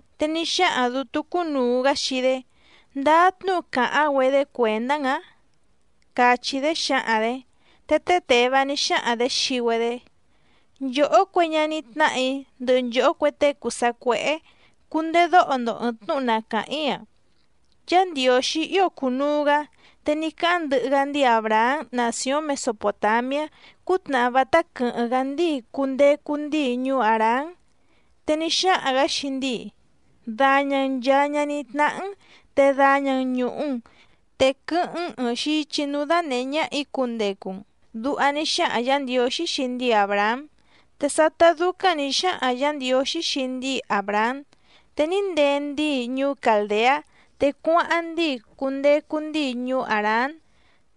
Te ní xáhaⁿ dǔtú cúnùu‑gá xii‑dé: —¿Ndáá tnúhu càháⁿ‑güedé cuèndá‑n‑ǎⁿ? —càchí‑dé xǎhaⁿ‑dě. Te té Těvá ní xáhaⁿ‑dě xii‑güedé: —Nchòhó cue ñaní tnáhà‑í ndɨhɨ nchòhó cue tée cùu sacuéhé, cundedóho‑ndo ɨ̀ɨⁿ tnúhu na càháⁿ‑í‑a. Yá Ndiǒxí ío cùnuu‑gá, te ní cáháⁿ ndɨhɨ‑gá ndíi Àbrahám nàcióⁿ Mesopòtamiá cútnàhá vátá quɨ̀hɨ́ⁿ‑gá ndíi cundecu ndíi ñuú Hàrán. Te ní xáhaⁿ‑gǎ xii ndíi: “Daña‑n nchàa ñaní tnáhá‑n, te daña‑n ñùhu‑n, te quɨ́hɨ́ⁿ‑n ɨ̀ɨⁿ xichi núú dánèhé ñáhà‑í cundecu‑n”, duha ní xáhaⁿ Yǎ Ndiǒxí xii ndíi Àbrahám. Te sátá dúcáⁿ nǐ xáhaⁿ Yǎ Ndiǒxí xii ndíi Àbrahám, te ní ndee ndíi ñuú Càldeá, te cuáháⁿ ndíi cundecu ndíi ñuú Hàrán.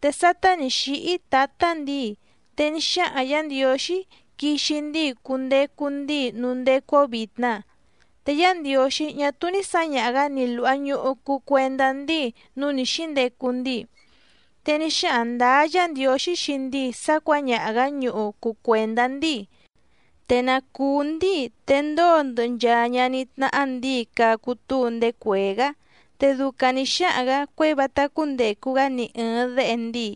Te sátá nǐ xíhí tǎtá ndǐi, te ní xáhaⁿ Yǎ Ndiǒxí quixi ndíi cundecu ndíi núú ndécú‑ó vìtna. Te Yá Ndiǒxí ñá túú ní sǎñaha‑gǎ ni lùha ñuhu cuu cuendá ndíi núú nǐ xíndecu ndíi. Te ní xáhaⁿ ndǎá Yǎ Ndiǒxí xii ndíi sá cuǎñaha‑gǎ ñuhu cuu cuèndá ndíi, te na cùú ndíi, te ndóo ndɨhɨ nchaa ñaní tnáhá ndǐi cacu túu ndéé cuèé‑gá. Te ducaⁿ nǐ xáhaⁿ‑gǎ cuěi vátá cúndècu‑gá ni ɨ̀ɨⁿ déhe ndíi.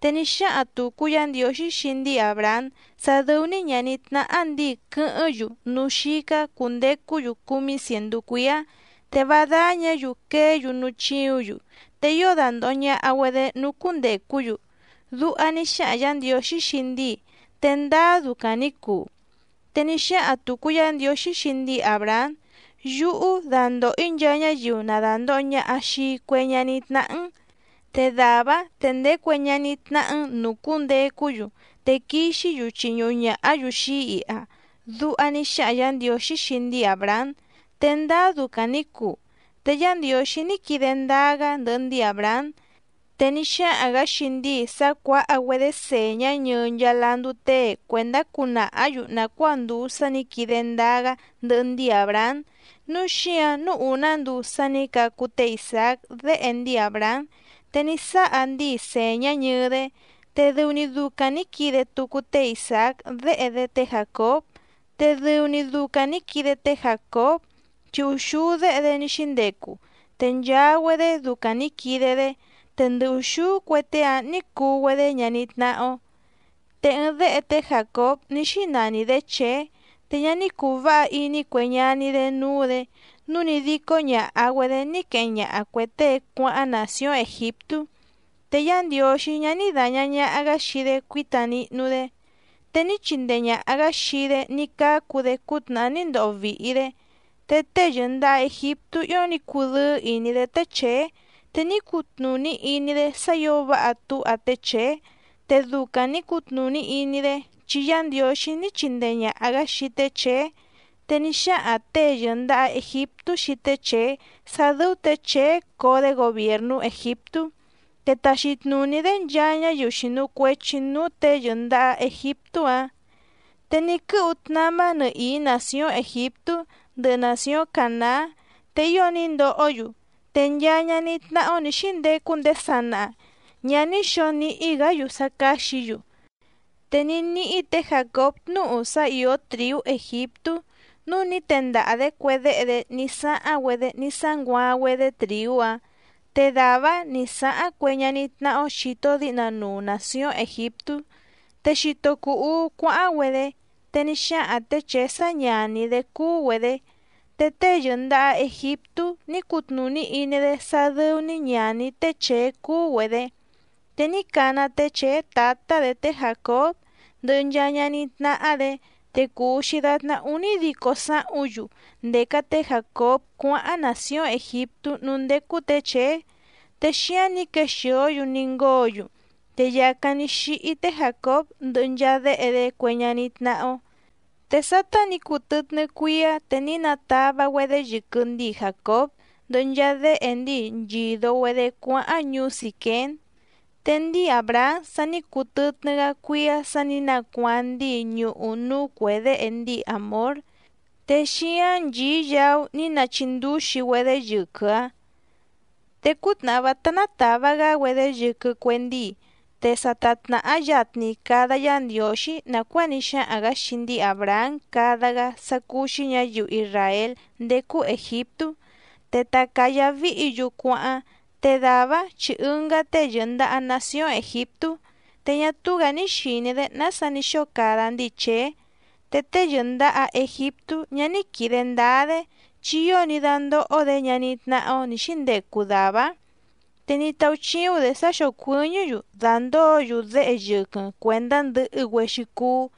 Te ní xáhaⁿ tùcu Yá Ndiǒxí xii ndíi Àbrahám sá dɨ́ú‑ní ñàní tnáhá ndǐi quɨ́hɨ́ⁿ‑yu núú xícá cùndecú‑yu cúmí cièndú cuíá, te vá dáñǎ‑yu queé‑yu núú chíǔⁿ‑yu, te ío dandòho ñaha‑güedé núú cúndècú‑yu. Duha ní xáhaⁿ Yǎ Ndiǒxí xii ndíi, te ndáá ducaⁿ nǐ cuu. Te ní xáhaⁿ tùcu Yá Ndiǒxí xii ndíi Àbrahám: “Yúhú dandòho‑í nchaa ñáyiu na dàndoho ñaha xii cue ñaní tnáhá‑n. Te dàvá‑áⁿ te ndee cue ñaní tnáhá‑n nǔú cúndècú‑yu, te quixí‑yu chiñuhu ñàhá‑yu xii‑í iha”, duha ní xáhaⁿ Yǎ Ndiǒxí xii ndíi Àbrahám, te ndáá ducaⁿ nǐ cuu. Te Yá Ndiǒxí ní quide ndáá‑gá ndɨhɨ ndíi Àbrahám, te ní xáhaⁿ‑gǎ xii ndíi sá cuǎha‑güedé sèñá ñɨɨ nchaa landú tée cuèndá cunàhá‑yu nàcuáa ndùu sá nǐ quide ndáá‑gá ndɨhɨ ndíi Àbrahám. Núu xíǎⁿ núú ùná nduu sá nǐ cacu té Isàác déhe ndíi Àbrahám, te ní sáha ndíi sèñá ñɨɨ‑dé. Te dɨu‑ni ducaⁿ nǐ quide tucu té Isàác déhe‑dé té Jàcób, te dɨu‑ni ducaⁿ nǐ quide té Jàcób, chi úxúú déhe‑dé ní xíndecu, te nchaa‑güedé ducaⁿ nǐ quide‑dé. Te ndɨ ùxúú cue tée‑áⁿ nǐ cuu‑güedé ñaní tnáhá‑ó. ’Te ɨɨⁿ déhe té Jàcób ní xínani‑dě Chèé. Te ñá ní cùu váha iní cue ñaní‑dé núú‑dě, núu ní dícó ñàha‑güedé ní queheⁿ ñaha cuè tée cuáháⁿ nàcióⁿ Ègiptú, te Yá Ndiǒxí ñá ní dàña ñaha‑gá xii‑dé cuíta nihnu‑dé. Te ní chindee ñàha‑gá xii‑dé ní cácu‑dé cútnàhá ní ndoho vìhi‑dé. Te tée yɨ̀ndaha Egiptú ío ní cudɨ́ɨ́ ìní‑dé té Chèé, te ní cutnùní iní‑dé sá ǐo váha túha té Chèé, te ducaⁿ nǐ cutnùní iní‑dé, chi Yá Ndiǒxí ní chindee ñàha‑gá xii té Chèé. Te ní xáhaⁿ těe yɨ̀ndaha Egiptú xii té Chèé sá dɨ́ú tě Chèé coo‑dé gobièrnú Ègiptú, te taxi tnùní‑dé nchaa ñáyiu xìnu cuechi núú těe yɨ̀ndaha Egiptú‑áⁿ. ’Te ní quɨ́hu tnamá nɨhìí nàcióⁿ Ègiptú ndɨhɨ nàcióⁿ Cànaá, te ío ní ndohó‑yu. Te nchaa ñaní tnáhá‑ó nǐ xíndecu ndéé sanaha ñǎ ní xǒo níhí‑gǎ‑yu sá cáxǐ‑yu. Te ní níhí tě Jàcób tnúhu sá ìó trìú Ègiptú, núu ní tendaha‑dě cue déhe‑dé ní sáháⁿ‑güedé ní sánguaaⁿ‑güedé trìú‑áⁿ, te dàvá‑áⁿ nǐ sáháⁿ cue ñaní tnáhá‑ó xìto díhna nuu nàcióⁿ Ègiptú. Te xito cùu uú cuáháⁿ‑güedé, te ní xáhaⁿ tě Chèé sá ñàní‑dé cúú‑güedě. Te tée yɨ̀ndaha Egiptú ní cutnùní iní‑dé sá dɨ́ú‑ní ñàní té Chèé cúú‑güedě. Te ní cana té Chèé tǎtá‑dě té Jàcób ndɨhɨ nchaa ñaní tnáhá‑dě. Te cùu‑xi datná únídico sáhúⁿ‑yu ndèca té Jàcób cuáháⁿ nàcióⁿ Ègiptú núú ndécú tě Chèé, te xíáⁿ nǐ quexìó‑yu ní ngóo‑yu. Te yàcáⁿ ní xíhí té Jàcób ndɨhɨ nchaa déhe‑dé cue ñaní tnáhá‑ó. Te sátá nǐ cuu tɨtnɨ́ cuíá, te ní natava‑güedé yɨquɨ ndíi Jàcób ndɨhɨ nchaa déhe ndíi nchìdo‑güedé cuáháⁿ ñuú Sìquém. Te ndíi Àbrahám sa ní cuu tɨtnɨ́‑gá cuíá sǎ nǐ nacuaaⁿ ndíi ñuhu núú cuè déhe ndíi Hàmór. Te xíáⁿ nchìí yaú ní nachindúxi‑güedé yɨquɨ‑áⁿ. ’Te cútnàhá vátá nátàva‑gá‑güedé yɨquɨ cue ndíi, te sa ta tnàhá yatni cada Yá Ndiǒxí nàcuáa ní xáhaⁿ‑gǎ xii ndíi Àbrahám cada‑gá sá cúú‑xí ñǎyiu isràél ndécú Ègiptú, te ta cǎyá víhǐ‑yu cuáháⁿ. Te dàvá‑áⁿ chi ɨngá tée yɨ̀ndaha nacióⁿ Ègiptú, te ñá túú‑gǎ ní xìní‑dé nása ní xóo cada ndíi Chèé. Te tée yɨ̀ndaha Egiptú ñá ní quìde ndáá‑dé, chi ío ní dándóhó‑dě ñaní tnáhá‑ó nǐ xíndecu dàvá‑áⁿ. Te ní táúchíúⁿ‑dě sá xócuɨ̀ñɨ́‑yu dàndóo‑yu déhe yɨquɨⁿ cuèndá ndɨhɨ‑güexi cuú.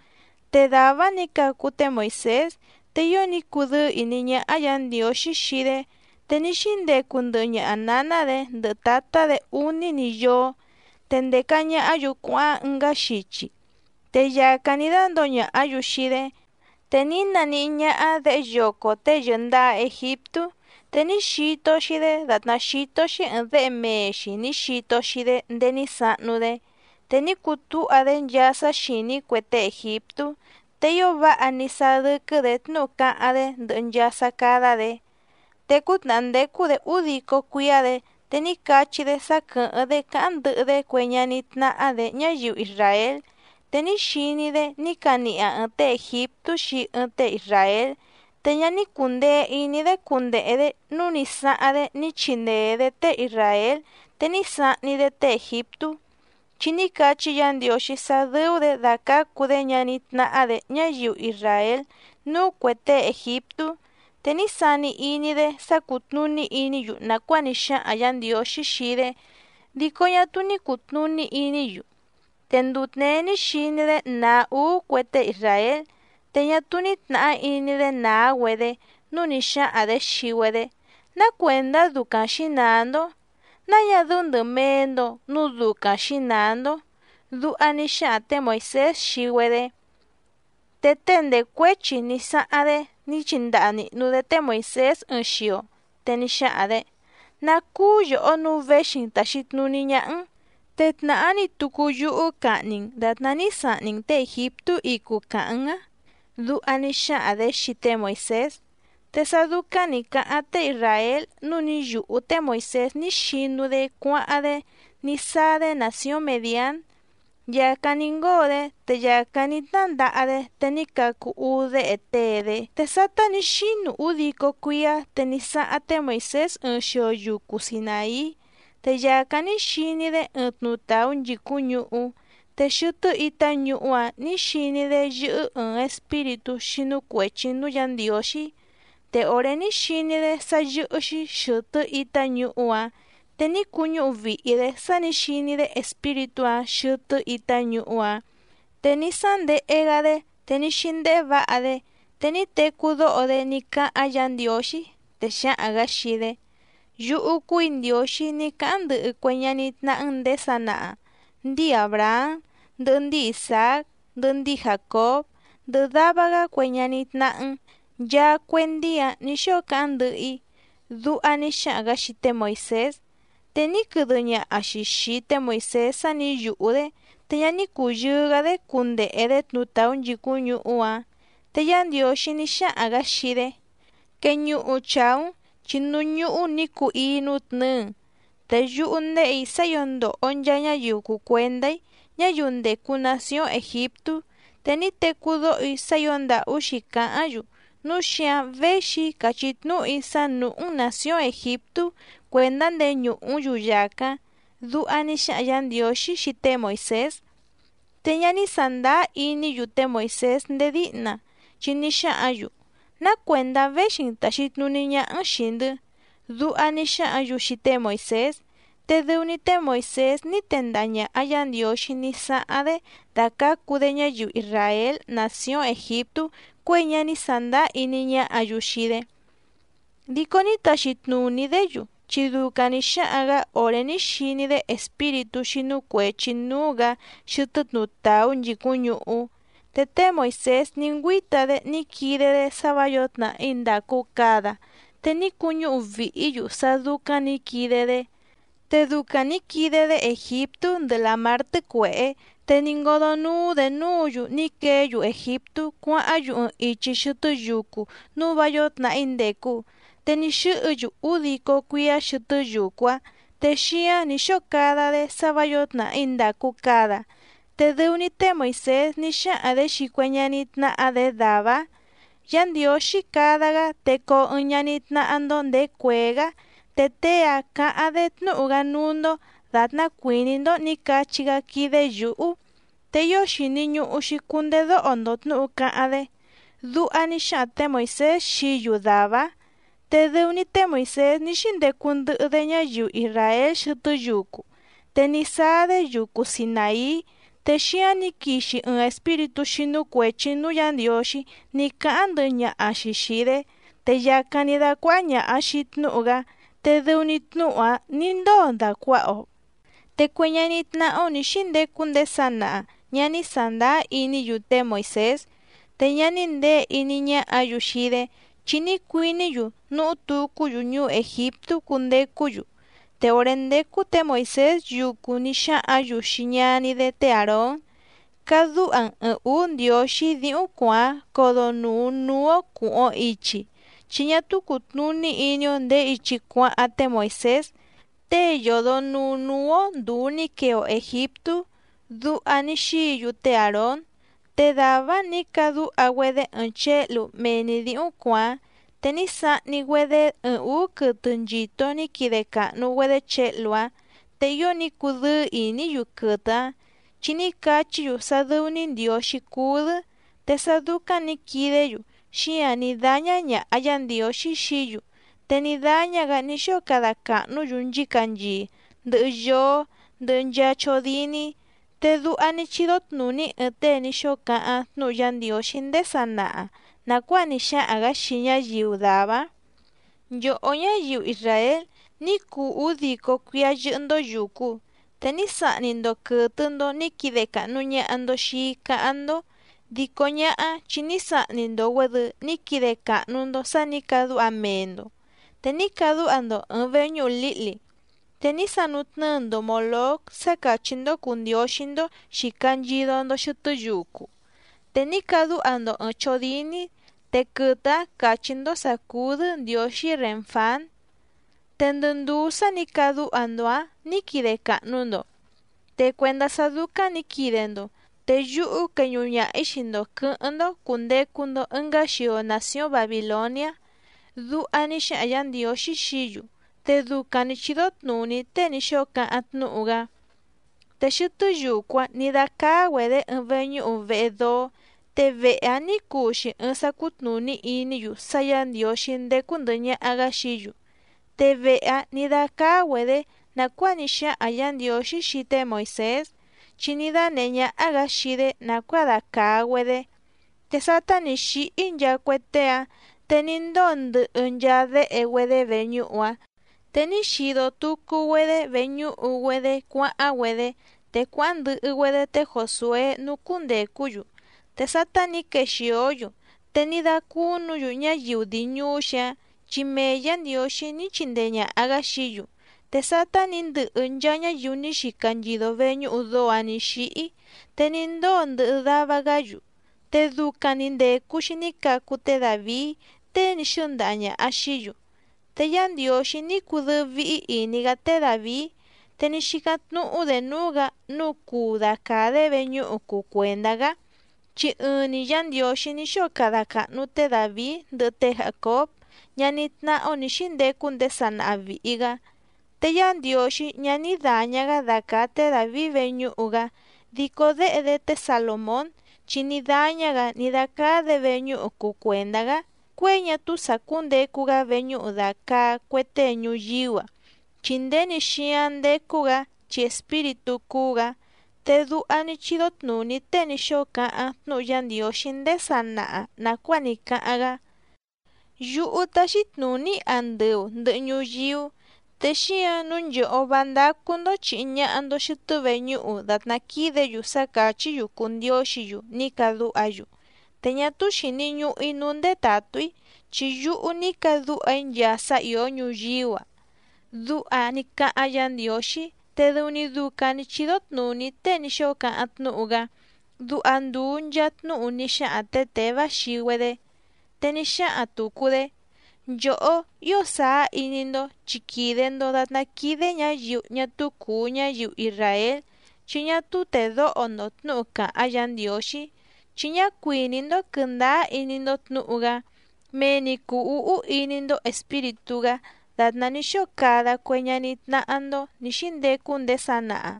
Te dàvá‑áⁿ nǐ cacu té Moìsés, te ío ní cudɨ́ɨ́ ìní ñáhá Yǎ Ndiǒxí xii‑dé. Te ní xíndecu ndɨhɨ ñaha nǎná‑dě ndɨhɨ tǎtá‑dě úní‑ni yóó. Te ndèca ñahá‑yu cuáháⁿ ɨngá xichi, te yàcáⁿ ní dándǒo ñàhá‑yu xii‑dé, te ní naníhí ñáhá děhe yoco tée yɨ̀ndaha Egiptú, te ní xito‑xi‑dé dàtná xító‑xí ɨ̀ɨⁿ déhe mee‑xi nǐ xito‑xi‑dé ndéé ní sahnu‑dé. Te ní cutúha‑dé nchaa sá xìní cue tée ègiptú, te ío váha ní sáá dɨ́quɨ́‑dě tnúhu cáháⁿ‑dé ndɨhɨ nchaa sá cádá‑dě. ’Te cútnàhá ndécú‑dě údico cuíá‑dě, te ní cachí‑dé sá quɨ̀hɨ́ⁿ‑dé cáháⁿ ndɨhɨ‑dé cue ñaní tnáhá‑dě ñáyiu isràél. Te ní xiní‑dé ní caniha ɨ̀ɨⁿ tée ègiptú xii ɨɨⁿ tée isràél, te ñá ní cùndee iní‑dé cundehe‑dě nǔu ní sáháⁿ‑dé ní chindee‑dě tée isràél, te ní sahni‑dé tée ègiptú, chi ní cachí Yǎ Ndiǒxí sá dɨ́ú‑dě dacǎcu‑dé ñaní tnáhá‑dě ñáyiu isràél núú cuè tée ègiptú. Te ní sani iní‑dé sá cútnùní iní‑yu nàcuáa ní xáhaⁿ Yǎ Ndiǒxí xii‑dé, dico ñá túú ní cùtnuní iní‑yu. Te nduu tněé ní xiní‑dé nàá úú cue tée isràél, te ñá túú ní tnàhá iní‑dé nàá‑güedé nǔu ní xáhaⁿ‑dě xii‑güedé: “¿Ná cuèndá ducaⁿ xǐnàá‑ndó? ¿Náa ñá dɨ́ú ndɨ̀mee‑ndo núu ducaⁿ xǐnàá‑ndó?” Duha ní xáhaⁿ tě Moìsés xii‑güedé. Te tée ndècuéchi ní sáháⁿ‑dé ní chindaha nìhnu‑dé té Moìsés ɨɨⁿ xio, te ní xáhaⁿ‑dě: “¿Ná cúú yòhó nǔu véxi‑n tàxi tnuní ñáhá‑n? Te tnàhá‑ni tucu yúhú cahni‑n dàtná ní sahni‑n těe ègiptú icu càhaⁿ‑n á”, duha ní xáhaⁿ‑dě xii té Moìsés. Te sá dúcáⁿ nǐ cáháⁿ tée isràél nǔu ní yùhú té Moìsés ní xinu‑dé cuáháⁿ‑dé ní sáá‑dé nàcióⁿ Mèdián. Yàcáⁿ ní ngóo‑dé, te yàcáⁿ ní tnándaha‑dé, te ní cacu úú déhe tée‑dé. ’Te sátá nǐ xínu údico cuíá, te ní sáháⁿ té Moìsés ɨɨⁿ xio yucu Sinàí. Te yàcáⁿ ní xiní‑dé ɨɨⁿ tnutàú nchìcúⁿ ñuhú, te xɨtɨ́ itá ñuhú‑áⁿ nǐ xiní‑dé yɨ́hɨ́ ɨ̀ɨⁿ espíritú xínú cuèchi núú Yǎ Ndiǒxí. Te òré ní xiní‑dé sá yɨ́hɨ́‑xí xɨ̀tɨ́ itá ñuhú‑áⁿ, te ní cuñúhu vìhi‑dé sá nǐ xiní‑dé espíritú‑áⁿ xɨtɨ́ itá ñuhú‑áⁿ, te ní sándehe‑gá‑dé, te ní xíndéhé vǎha‑dé. Te ní tecú dóho‑dé ní cáháⁿ Yǎ Ndiǒxí, te xáhaⁿ‑gǎ xii‑dé: “Yúhú cúù‑í Ndiǒxí ní cáháⁿ ndɨhɨ cue ñaní tnáhá‑n nděé sanaha, ndíi Àbrahám ndɨhɨ ndíi Isàác ndɨhɨ ndíi Jàcób, ndɨhɨ dava‑gá cue ñaní tnáhá‑n. Nchaa cue ndíi‑áⁿ nǐ xóo cáháⁿ ndɨhɨ‑í.” Duha ní xáhaⁿ‑gǎ xii té Moìsés. Te ní quɨdɨ ñaha‑xi xìi té Moìsés sá nǐ yùhú‑dé, te ñá ní cùyɨɨ‑gá‑dé cundehe‑dě tnutàú nchìcúⁿ ñuhú‑áⁿ. Te Yá Ndiǒxí ní xáhaⁿ‑gǎ xii‑dé: “Queñuhu chàú‑n, chi núú ñúhú nǐ cuu íí nútnɨ̌ɨ‑n. Te yúhú ndéhè‑í sá ǐo ndòho nchaa ñáyiu cùu cuendá‑í, ñáyiu ndècu nacióⁿ Ègiptú. Te ní tecú dóho‑í sá ǐo ndàhú xǐcáháⁿ‑yu, núu xíǎⁿ véxi‑í càchí tnúhu‑í sá nùhú‑n nàcióⁿ Ègiptú cuèndá ndeñùhú‑n‑yu yàcáⁿ.” Duha ní xáhaⁿ Yǎ Ndiǒxí xii té Moìsés. ’Te ñá ní sàndáá iní‑yu té Moìsés ndéé díhna, chi ní xáhǎⁿ‑yu: “¿Ná cuèndá véxi‑n tàxi tnuní ñáhá‑n xìi‑ndɨ́?” Duha ní xáhǎⁿ‑yu xii té Moìsés. Te dɨu‑ni té Moìsés ní tendaha ñàha Yá Ndiǒxí ní sáháⁿ‑dé dacǎcu‑dé ñáyiu isràél nàcióⁿ Ègiptú cuěi ñá ní sàndáá iní ñáhǎ‑yu xii‑dé. Dico ní taxi tnùní‑dé‑yu, chi ducaⁿ nǐ xáhaⁿ‑gǎ òré ní xiní‑dé espíritú xínú cuèchi núú‑gǎ xɨtɨ́ tnutàú nchìcúⁿ ñuhú. Te té Moìsés ní ngüíta‑dé ní quide‑dé sá vǎ yǒo tnàhí ndàcu cada, te ní cuñúhu vìhí‑yu sá dúcáⁿ nǐ quide‑dé, te ducaⁿ nǐ quide‑dé Ègiptú ndɨhɨ Làmár Tɨ́cuèhé. Te ní ngódó núú‑dě núǔ‑yu ní queé‑yu Ègiptú cuáháⁿ‑yu ɨɨⁿ ichi xɨtɨ́ yucu núú vǎ yǒo tnàhí ndècu, te ní xɨ́hɨ‑yu údico cuíá xɨtɨ́ yucu‑áⁿ, te xíáⁿ nǐ xóo cada‑dé sá vǎ yǒo tnàhí ndàcu cada. Te dɨu‑ni té Moìsés ní xáhaⁿ‑dě xii cue ñaní tnáhá‑dě dàvá‑áⁿ: “Yá Ndiǒxí cada‑gá te coo ɨɨⁿ ñaní tnáhá‑ndó nděé cuèé‑gá, te tée‑áⁿ cǎháⁿ‑dé tnúhu‑gá núú‑ndó dàtná cuìní‑ndó nǐ cachí‑gá quídé yǔhú, te ío xìni ñuhu‑xi cundedóho‑ndo tnǔhu cáháⁿ‑dé”, duha ní xáhaⁿ tě Moìsés xií‑yu dàvá‑áⁿ. Te dɨu‑ni té Moìsés ní xíndecu ndɨhɨ‑dé ñáyiu isràél xɨtɨ́ yucu, te ní sáá‑dé yucu Sinàí, te xíáⁿ nǐ quixi ɨɨⁿ espíritú xínú cuèchi núú Yǎ Ndiǒxí ní cáháⁿ ndɨhɨ ñaha‑xi xìi‑dé, te yàcáⁿ ní dácuáhá ñàha‑xi tnúhu‑gá, te dɨu‑ni tnúhu‑áⁿ nǐ ndóo dàcuaha‑o. ’Te cue ñaní tnáhá‑ó nǐ xíndecu ndéé sanaha ñǎ ní sàndáá iní‑yu té Moìsés, te ñá ní nděe iní ñáhǎ‑yu xii‑dé, chi ní cuiní‑yu nuhú tucú‑yu ñuú Ègiptú cundecú‑yu. Te òré ndécú tě Moìsés yucu ní xáhǎⁿ‑yu xii ñaní‑dé té Àrón: “Cadúha‑n ɨ̀ɨⁿ úú ndiǒxí díhúⁿ cuàáⁿ codonùu núú‑ó cùhuⁿ‑o ichi, chi ñá túú cùtnuní iní‑ó ndèé ichi cuáháⁿ té Moìsés, tée yòdo nuu núú‑ó ndùu ní quee‑o Ègiptú”, duha ní xíǐ‑yu té Àrón. Te dàvá‑áⁿ nǐ cadúha‑güedé ɨɨⁿ chěhlu mee‑ni dǐhúⁿ cuàáⁿ, te ní sahni‑güedé ɨɨⁿ ǔú quɨtɨ nchìto ní quide càhnu‑güedé chěhlu‑áⁿ. Te ío ní cudɨ́ɨ́ ìní‑yu quɨtɨ‑áⁿ, chi ní cachí‑yu sá dɨ́ú‑ní ndiǒxí cúú‑dɨ́. Te sá dúcáⁿ nǐ quidé‑yu, xíǎⁿ ní dáñá ñàha Yá Ndiǒxí xií‑yu. Te ní dáñá‑gǎ ní xóo cada càhnú‑yu nchícanchii, ndɨhɨ yóó, ndɨhɨ nchaa chódíní. Te duha ní chídó tnùní ɨɨⁿ tée ní xóo cáháⁿ tnúhu Yá Ndiǒxí ndéé sanaha nàcuáa ní xáhaⁿ‑gǎ xii ñáyiu dàvá‑áⁿ: Nchòhó ñáyiu isràél, ní cuu údico cuíá yɨ́hɨ́‑ndó yùcu, te ní sahni‑ndo quɨ̀tɨ‑ndo ní quide càhnu ñaha‑ndo xii‑í cáháⁿ‑ndó, dico ñáhá chi ní sahni‑ndo‑güèdɨ ní quide càhnu‑ndo sá nǐ cadúha mee‑ndo. Te ní cadúha‑ndo ɨ̀ɨⁿ veñúhu lǐhli, te ní sanutnɨ́ɨ‑ndo Mòlóc sá càchí‑ndó cùu ndióxí‑ndó xìca nchido‑ndo xɨtɨ́ yucu, te ní cadúha‑ndo ɨ̀ɨⁿ chódíní, te quɨtɨ‑ǎⁿ càchí‑ndó sǎ cúú‑dɨ́ ndiǒxí Rènfán, te ndɨ ndùú sá nǐ cadúha‑ndo‑ǎⁿ nǐ quide càhnu‑ndo. Te cuèndá sá dúcáⁿ nǐ quide‑ndo te yúhú queñuhu ñaha‑ǐ xii‑ndo quɨ̌hɨ́ⁿ‑ndó cùndecu‑ndo ɨngá xio nàcióⁿ Babìloniá. Duha ní xáhaⁿ Yǎ Ndiǒxí xií‑yu, te ducaⁿ nǐ chídó tnùní tée ní xóo cáháⁿ tnúhu‑gá. ’Te xɨtɨ́ yucu‑áⁿ nǐ dácáá‑güedě ɨɨⁿ veñúhu vehe dóó. Te vehe‑áⁿ nǐ cuu‑xi ɨɨⁿ sá cútnùní iní‑yu sá Yǎ Ndiǒxí ndécú ndɨ̀hɨ ñaha‑gá xií‑yu. Te vehe‑áⁿ nǐ dácáá‑güedě nàcuáa ní xáhaⁿ Yǎ Ndiǒxí xii té Moìsés, chi ní dánèhé ñáhá‑gǎ xii‑dé nàcuáa dacàa‑güedé. Te sátá nǐ xíhí nchaa cue tée‑áⁿ, te ní ndóo ndɨhɨ nchaa déhe‑güedé veñúhu‑áⁿ. Te ní xido tucu‑güedé veñúhu‑güedé cuáháⁿ‑güedé, te cuáháⁿ ndɨhɨ‑güedé té Jòsué núú cúndècú‑yu. Te sátá nǐ quexìó‑yu, te ní dácúnǔ‑yu ñáyiu dii ñùú‑xi‑áⁿ chi mee Yǎ Ndiǒxí ní chindee ñàha‑gá xií‑yu. Te sátá nǐ ndɨhɨ nchaa ñáyiu ní xica nchido veñúhu dóó‑ǎⁿ nǐ xíhí, te ní ndóo ndɨhɨ dava‑gá‑yu. Te ducaⁿ‑ni ndècu‑xi ní cacu té Dàvií, tée ní xɨ́ndaha ñàha xií‑yu. Te Yá Ndiǒxí ní cudɨ́ɨ́ víhí ìní‑gá té Dàvií. Te ní xícáⁿ tnúhú‑dě núú‑gǎ nǔu cuu dacàa‑dé veñúhu cuu cuèndá‑gá, chi ɨɨⁿ‑ni Yá Ndiǒxí ní xóo cada càhnu té Dàvií ndɨhɨ té Jàcób, ñaní tnáhá‑ó nǐ xíndecu ndéé sanaha vìhi‑gá. Te Yá Ndiǒxí ñá ní dàña‑gá dacàa té Dàvií veñúhu‑gá dico déhe‑dé té Salòmón, chi ní dáñá‑gǎ ní dácáá‑dě veñúhu cuu cuèndá‑gá cuěi ñá túú sàcúndecu‑gá veñúhu dàcaa cue tée ñuyíú‑a, chi nděni xíáⁿ ndécú‑gǎ chi espíritú cúú‑gǎ. Te duha ní chídó tnùní tée ní xóo cáháⁿ tnúhu Yá Ndiǒxí ndéé sanaha nàcuáa ní cáháⁿ‑gá: Yúhú táxí tnùní‑í andɨu ndɨ̀hɨ ñuyíú, te xíǎⁿ nǔu nchòhó vá ndácú‑ndó chìhi ñaha‑ndo xɨtɨ́ veñúhu dàtná quídě‑yu sá càchí‑yu cùu ndióxǐ‑yu ní cadúha‑yu. Te ñá túú xìni ñuhu‑í núú ndétàtú‑í, chi yúhú ní cadúha‑í nchaa sá ìó ñuyíú‑a. Duha ní cáháⁿ Yǎ Ndiǒxí, te dɨu‑ni ducaⁿ nǐ chídó tnùní tée ní xóo cáháⁿ tnúhu‑gá —duha ndùu nchaa tnúhu ní xáhaⁿ tě Těvá xii‑güedé. Te ní xáhaⁿ tùcu‑dé: —Nchòhó, ío sàá iní‑ndó chi quìde‑ndo datná quídé ñǎyiu ñá túú cùu ñáyiu isràél chi ñá túú tèdóho‑ndo tnǔhu càháⁿ Yǎ Ndiǒxí, chi ñá cuìní‑ndó quɨ̀ndáá iní‑ndó tnǔhu‑gá, mee‑ni cùu úhú iní‑ndó Espíritú‑gá dàtná ní xóo cada cue ñaní tnáhá‑ndó nǐ xíndecu ndéé sanaha.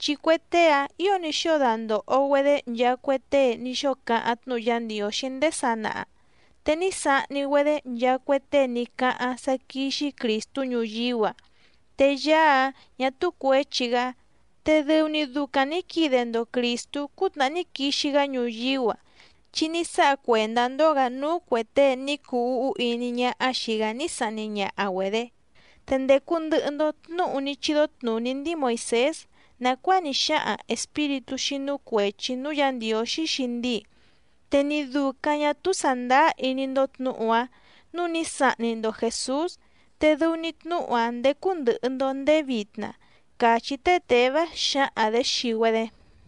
Chi cue tée‑áⁿ ǐo ní xóo dandòho‑güedé nchaa cue tée ní xóo cáháⁿ tnúhu Yá Ndiǒxí ndéé sanaha. Te ní sahni‑güedé nchaa cue tée ní cáháⁿ sá quíxí Crìstú ñuyíú‑a, te Yaá‑áⁿ ñà túú cuěchi‑gá. Te dɨu‑ni ducaⁿ nǐ quide‑ndo Crìstú cútnàhá ní quixi‑gá ñuyíú‑a, chi ní sáha cuèndá‑ndó‑gǎ núú cuè tée ní cuu úhú iní ñáhá xìi‑gá ní sahni ñaha‑güedě. Te ndècu ndɨhɨ‑ndo tnúhu ní chídó tnùní ndíi Moìsés nàcuáa ní xáhaⁿ espíritú xínú cuèchi núú Yǎ Ndiǒxí xii ndíi, te ni dùcaⁿ ñá túú sàndáá iní‑ndó tnǔhu‑áⁿ nǔu ní sahni‑ndo Jèsús. Te dɨu‑ni tnúhu‑áⁿ ndécú ndɨ̀hɨ‑ndo ndéé vitna —càchí té Těvá xǎhaⁿ‑dě xii‑güedé.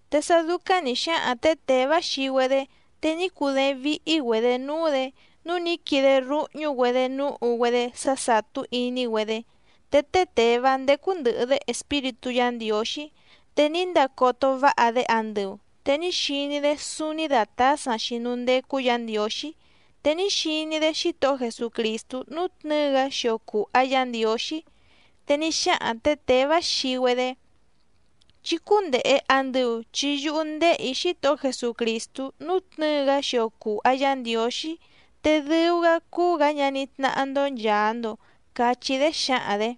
Te sá dúcáⁿ nǐ xáhaⁿ tě Těvá xii‑güedé, te ní cudééⁿ víhí‑güedě núú‑dě, núu ní quide rúhñú‑güedě núhu‑güedé sá sàtú iní‑güedé. Te té Těvá ndécú ndɨ̀hɨ‑dé Espíritú Yǎ Ndiǒxí, te ní ndacoto váha‑dé andɨu, te ní xiní‑dé súúní dàtásaⁿ‑xi núú ndécú Yǎ Ndiǒxí, te ní xiní‑dé Xítohó Jesucrìstú nútnɨ̌ɨ‑gá xio cùha Yá Ndiǒxí. Te ní xáhaⁿ tě Těvá xii‑güedé: —Chí cúndèhe andɨu chi yúhú ndéhè‑í Xítohó Jesucrìstú nútnɨ̌ɨ‑gá xio cùha Yá Ndiǒxí, te dɨu‑gá cúú‑gǎ ñaní tnáhá‑ndó nchàa‑ndo —cachí‑dé xǎhaⁿ‑dě.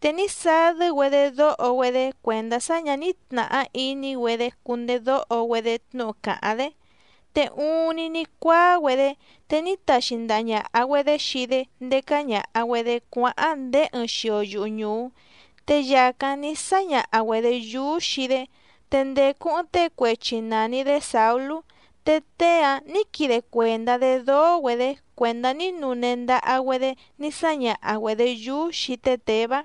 Te ní sadɨ́‑güedé dóho‑güedé cuèndá sá ñǎ ní tnàhá iní‑güedé cundedóho‑güedé tnúhu càháⁿ‑dé, te uuⁿni ní cuáá‑güedé, te ní taxi ndaha ñàha‑güedé xii‑dé ndécá ñàha‑güedé cuáháⁿ ndéé ɨɨⁿ xio yuhu ñùú, te yàcáⁿ ní sáñaha‑güedě yúú xii‑dé. Te ndècu ɨɨⁿ tée cuechi nàni‑dé Sàulú, te tée‑áⁿ nǐ quide cuèndá‑dé dóó‑güedě cuèndá ní nune ndaha‑güedé ní sáñaha‑güedě yúú xii té Těvá.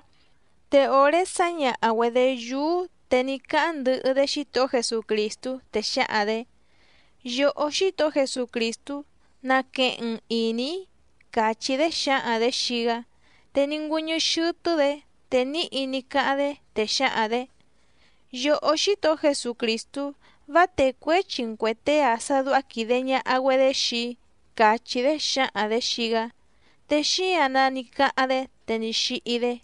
Te òré sǎñaha‑güedě yúú, te ní cáháⁿ ndɨhɨ‑dé Xítohó Jesucrìstú te xǎhaⁿ‑dě: —Yòhó Xítohó Jesucrìstú, naqueheⁿ‑n ìní‑í —càchí‑dé xǎhaⁿ‑dě xii‑gá. Te ní ngüɨ́ñɨ́ xɨ́tɨ́‑dě, te níhi ní cáháⁿ‑dé, te xǎhaⁿ‑dě: —Yòhó Xítohó Jesucrìstú, vá técuěchi‑n cuè tée‑a sá dúhá quìde ñaha‑güedé xii‑í —càchí‑dé xǎhaⁿ‑dě xii‑gá. Te xíǎⁿ‑nǎ ní cáháⁿ‑dé, te ní xíhí‑dé.